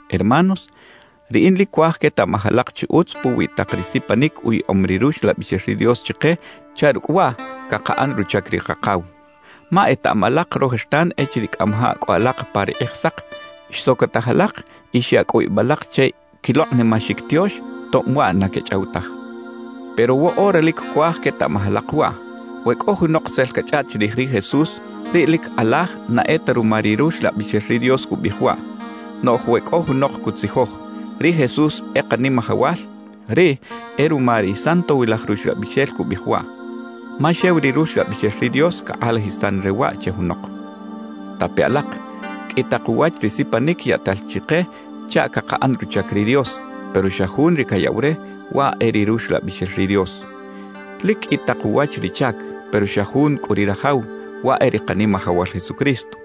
Hermanos, riꞌin lic cuaj quetaꞌmaj alak chi utz puwi tak ri sipanic uyaꞌom ri Ruxlabixel ri Dios chike chaꞌ rucꞌ waꞌ cakaꞌan ruchac ri Kakaw. Ma etaꞌam alak rojertan echiriꞌ cꞌamajaꞌ cꞌo alak pa ri Kꞌijsak, xsocotaj alak y xya cꞌu ib alak che quilokꞌnimaxic tiox tob waꞌ na quechꞌaw taj. Pero woꞌora lic cuaj quetaꞌmaj alak waꞌ: We cꞌo junok tzel cachꞌaꞌt chirij ri Jesús, riꞌ lic kꞌalaj na e ta ruma ri Ruxlabixel ri Dios cubiꞌij waꞌ. Noꞌj we cꞌo junok cutzijoj: «Ri Jesús e Kanimajawal,» riꞌ e ruma ri Santowilaj Ruxlabixel cubiꞌij waꞌ, ma xew ri Ruxlabixel ri Dios cakꞌalajisan re waꞌ che junok. Tape alak, qꞌui tak uwach ri sipanic yaꞌtal chike chaꞌ cakaꞌan ruchac ri Dios; pero xa Jun ri cayaꞌw re, waꞌ e ri Ruxlabixel ri Dios. Lic qꞌui tak uwach ri chac; pero xa Jun cꞌu ri rajaw, waꞌ e ri Kanimajawal Jesucristo.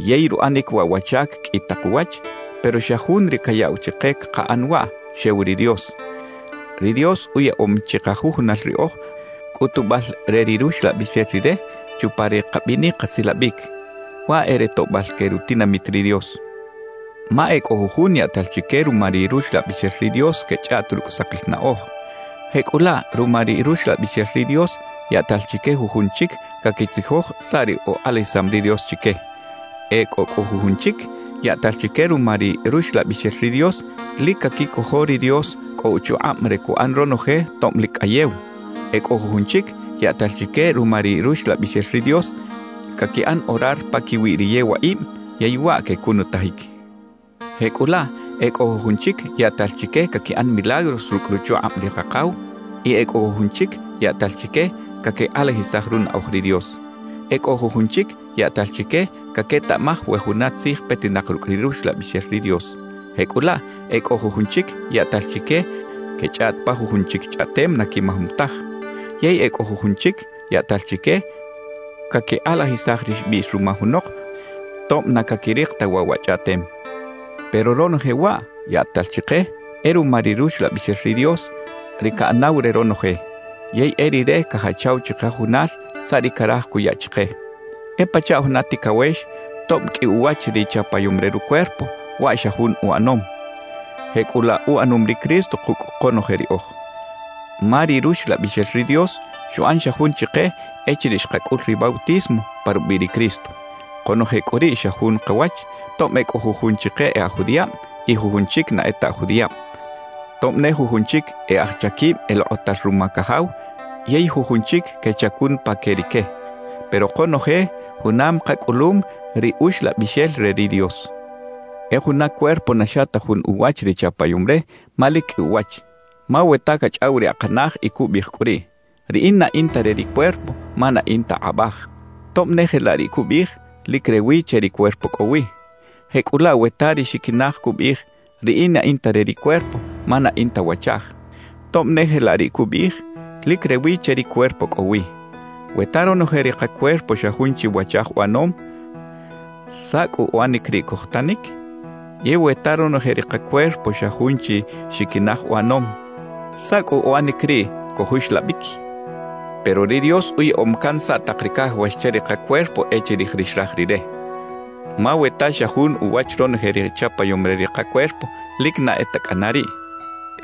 Yey ruꞌanic waꞌ wa chac qꞌui tak uwach; pero xa Jun ri cayaꞌw chike cakaꞌan waꞌ, xew ri Dios. Ri Dios uyaꞌom chikajujunal riꞌoj cꞌutubal re ri Ruxlabixel Rire chupa ri kabinic kasilabic, waꞌ e re toꞌbal que rutinamit ri Dios. Ma e cꞌo jujun yaꞌtal chique ruma ri Ruxlabixel ri Dios quechꞌaꞌt rucꞌ sakil naꞌoj. Jecꞌulaꞌ ruma ri Ruxlabixel ri Dios, yaꞌtal chique jujun chic caquitzijoj saꞌ ri ukꞌalajisam ri Dios chique. E cꞌo cꞌu jujun chic yaꞌtal chique ruma ri Ruxlabixel ri Dios lic caquicojo ri Dios cꞌo uchukꞌab re cuꞌan ronoje tob lic cꞌayew. E cꞌo jujun chic yaꞌtal chique ruma ri Ruxlabixel ri Dios caquiꞌan orar paquiwi ri yewaꞌib yey waꞌ quecunutajic. Jecꞌulaꞌ e cꞌo jujun chic yaꞌtal chique caquiꞌan milagros rucꞌ ruchukꞌab ri Kakaw, y e cꞌo jujun chic yaꞌtal chique caquikꞌalajisaj runaꞌoj ri Dios. E cꞌo jujun chic yaꞌtal chique caquetaꞌmaj we juna tzij petinak rucꞌ ri Ruxlabixel ri Dios. Jecꞌulaꞌ e cꞌo jujun chic yaꞌtal chique quechꞌaꞌt pa jujun chic chꞌaꞌtem na quimajom taj; yey e cꞌo cꞌu jujun chic yaꞌtal chique caquikꞌalajisaj ri xbiꞌx ruma junok tob na caquirik ta waꞌ wa chꞌaꞌtem. Pero ronoje waꞌ yaꞌtal chike, e ruma ri Ruxlabixel ri Dios, ri caꞌanaw re ronoje. Yey e Rire cajachaw chikajujunal saꞌ ri caraj cuya chike. E pachaꞌ juna ticawex, tob qꞌui uwach ri chapayom re rucuerpo, waꞌ xa jun uꞌanom. Jecꞌulaꞌ uꞌanom ri Cristo kucꞌ konoje riꞌoj. Ma ri Ruxlabixel ri Dios xuꞌan xa jun chike echiriꞌ xkacꞌul ri bautismo pa rubiꞌ ri Cristo. Konoje cꞌu riꞌ xa jun kawach, tob e cꞌo jujun chike e aj judiꞌab y jujun chic na e ta aj judiꞌab, tob ne jujun chic e aj chaquib elokꞌotal ruma cajaw yey jujun chic quechacun pa que rique; pero konoje junam kacꞌulum ri Uxlabixel re ri Dios. E juna cuerpo na xa ta jun uwach ri chapayom re, ma lic qꞌui uwach. Ma we ta cachꞌaw ri akanaj y cubiꞌij cꞌu riꞌ: «Riꞌin na in ta re ri cuerpo ma na in ta kꞌabaj.» Tob ne jelaꞌ riꞌ cubiꞌij, lic rewi che ri cuerpo cꞌo wi. Jecꞌulaꞌ we ta ri xiquinaj cubiꞌij: «Riꞌin na in ta re ri cuerpo ma na in ta wachaj.» Tob ne jelaꞌ riꞌ cubiꞌij, lic rewi che ri cuerpo cꞌo wi. We ta ronoje ri kacuerpo xa jun chi wachaj uꞌanom, ¿saꞌ cꞌu uꞌanic riꞌ cojtanic? Yey we ta ronoje ri kacuerpo xa jun chi xiquinaj uꞌanom, ¿saꞌ cꞌu uꞌanic riꞌ cojuxlabic? Pero ri Dios uyaꞌom can saꞌ tak ri cajawax che ri kacuerpo e chirij ri xraj Rire. Ma we ta xa jun uwach ronoje ri chapayom re ri kacuerpo, lic na e ta cꞌana riꞌ.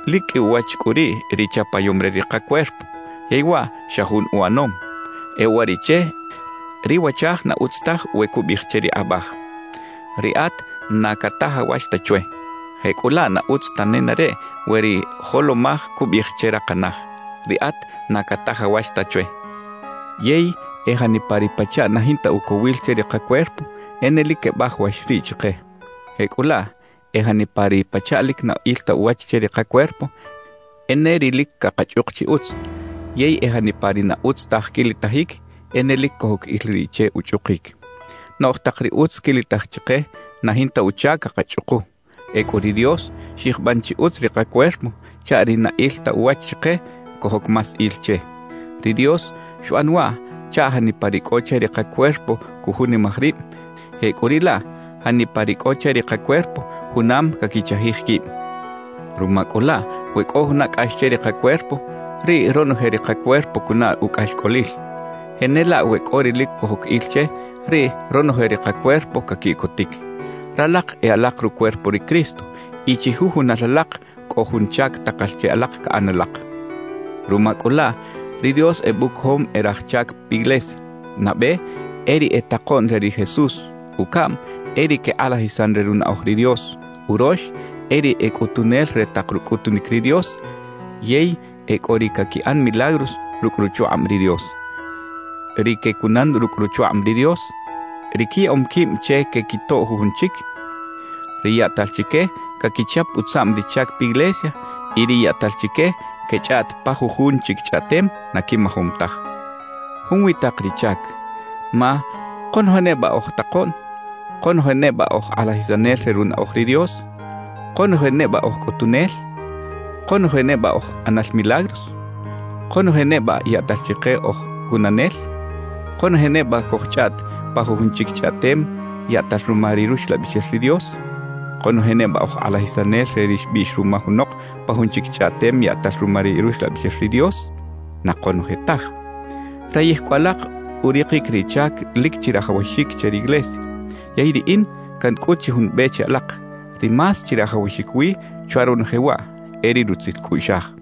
Lic qꞌui uwach cꞌu riꞌ ri chapayom re ri kacuerpo, yey waꞌ xa jun uꞌanom. E uwariꞌche ri wachaj na utz taj we cubiꞌij che ri kꞌabaj: «Riꞌat na catajawax ta chwe.» Jecꞌulaꞌ na utz ta nenareꞌ we ri jolomaj cubiꞌij che rakanaj: «Riꞌat na catajawax ta chwe.» Yey e janipa ri pachaꞌ na jinta ucowil che ri kacuerpo, e ne lic quebajawax riꞌ chike. Jecꞌulaꞌ e janipa ri pachaꞌ lic na il ta uwach che ri kacuerpo, e ne ri lic cakachꞌuk chi utz; yey e janipa ri na utz taj quilitajic, e ne lic cojoc il riꞌ che uchꞌukic. Noꞌj tak ri utz quilitaj chike, na jinta uchac cakachꞌuku. Ecꞌu ri Dios xyijban chi utz ri kacuerpo chaꞌ ri na il ta uwach chike, cojoc más il che. Ri Dios xuꞌan waꞌ chaꞌ janipa ri cꞌo che ri kacuerpo cujunimaj rib; jecꞌuriꞌlaꞌ janipa ri cꞌo che ri kacuerpo junam caquichajij quib. Ruma cꞌu laꞌ we cꞌo juna cꞌax che ri kacuerpo, riꞌ ronoje ri kacuerpo cunaꞌ ucꞌaxcꞌolil. Jenelaꞌ we cꞌo ri lic cojoc il che, riꞌ ronoje ri kacuerpo caquiꞌcotic. Ralak e alak rucuerpo ri Cristo y chijujunal alak cꞌo jun chac takal che alak caꞌan alak. Ruma cꞌu laꞌ ri Dios ebucojom e raj chac piglesia: nabe, e ri e takoꞌn re ri Jesús, ucaꞌm, e ri quekꞌalajisan re runaꞌoj ri Dios, urox, e ri e cꞌutunel re tak rucꞌutunic ri Dios, yey e cꞌo ri caquiꞌan milagros rucꞌ ruchukꞌab ri Dios, ri quecunan rucꞌ ruchukꞌab ri Dios, ri quiyaꞌom quib che quequitoꞌ jujun chic, ri yaꞌtal chique caquichap utzaꞌm ri chac piglesia y ri yaꞌtal chique quechꞌaꞌt pa jujun chic chꞌaꞌtem na quimajom taj. Junwi tak ri chac. Ma ¿konoje neba oj takoꞌn? ¿Konoje neba oj kꞌalajisanel re runaꞌoj ri Dios? ¿Konoje neba oj cꞌutunel? ¿Konoje neba oj ꞌanal milagros? ¿Konoje neba yaꞌtal chike oj cunanel? ¿Konoje neba cojchꞌaꞌt pa jujun chic chꞌaꞌtem yaꞌtal ruma ri Ruxlabixel ri Dios? ¿Konoje neba oj kꞌalajisanel re ri xbiꞌx ruma junok pa jun chic chꞌaꞌtem yaꞌtal ruma ri Ruxlabixel ri Dios? Na konoje taj. Rayij cꞌu alak urikic ri chac lic chirajawaxic che riglesia. Yey riꞌin cancꞌut chi jun be che alak, ri más chirajawaxic wi chwa ronoje waꞌ, e ri rutzil cꞌuꞌxaj.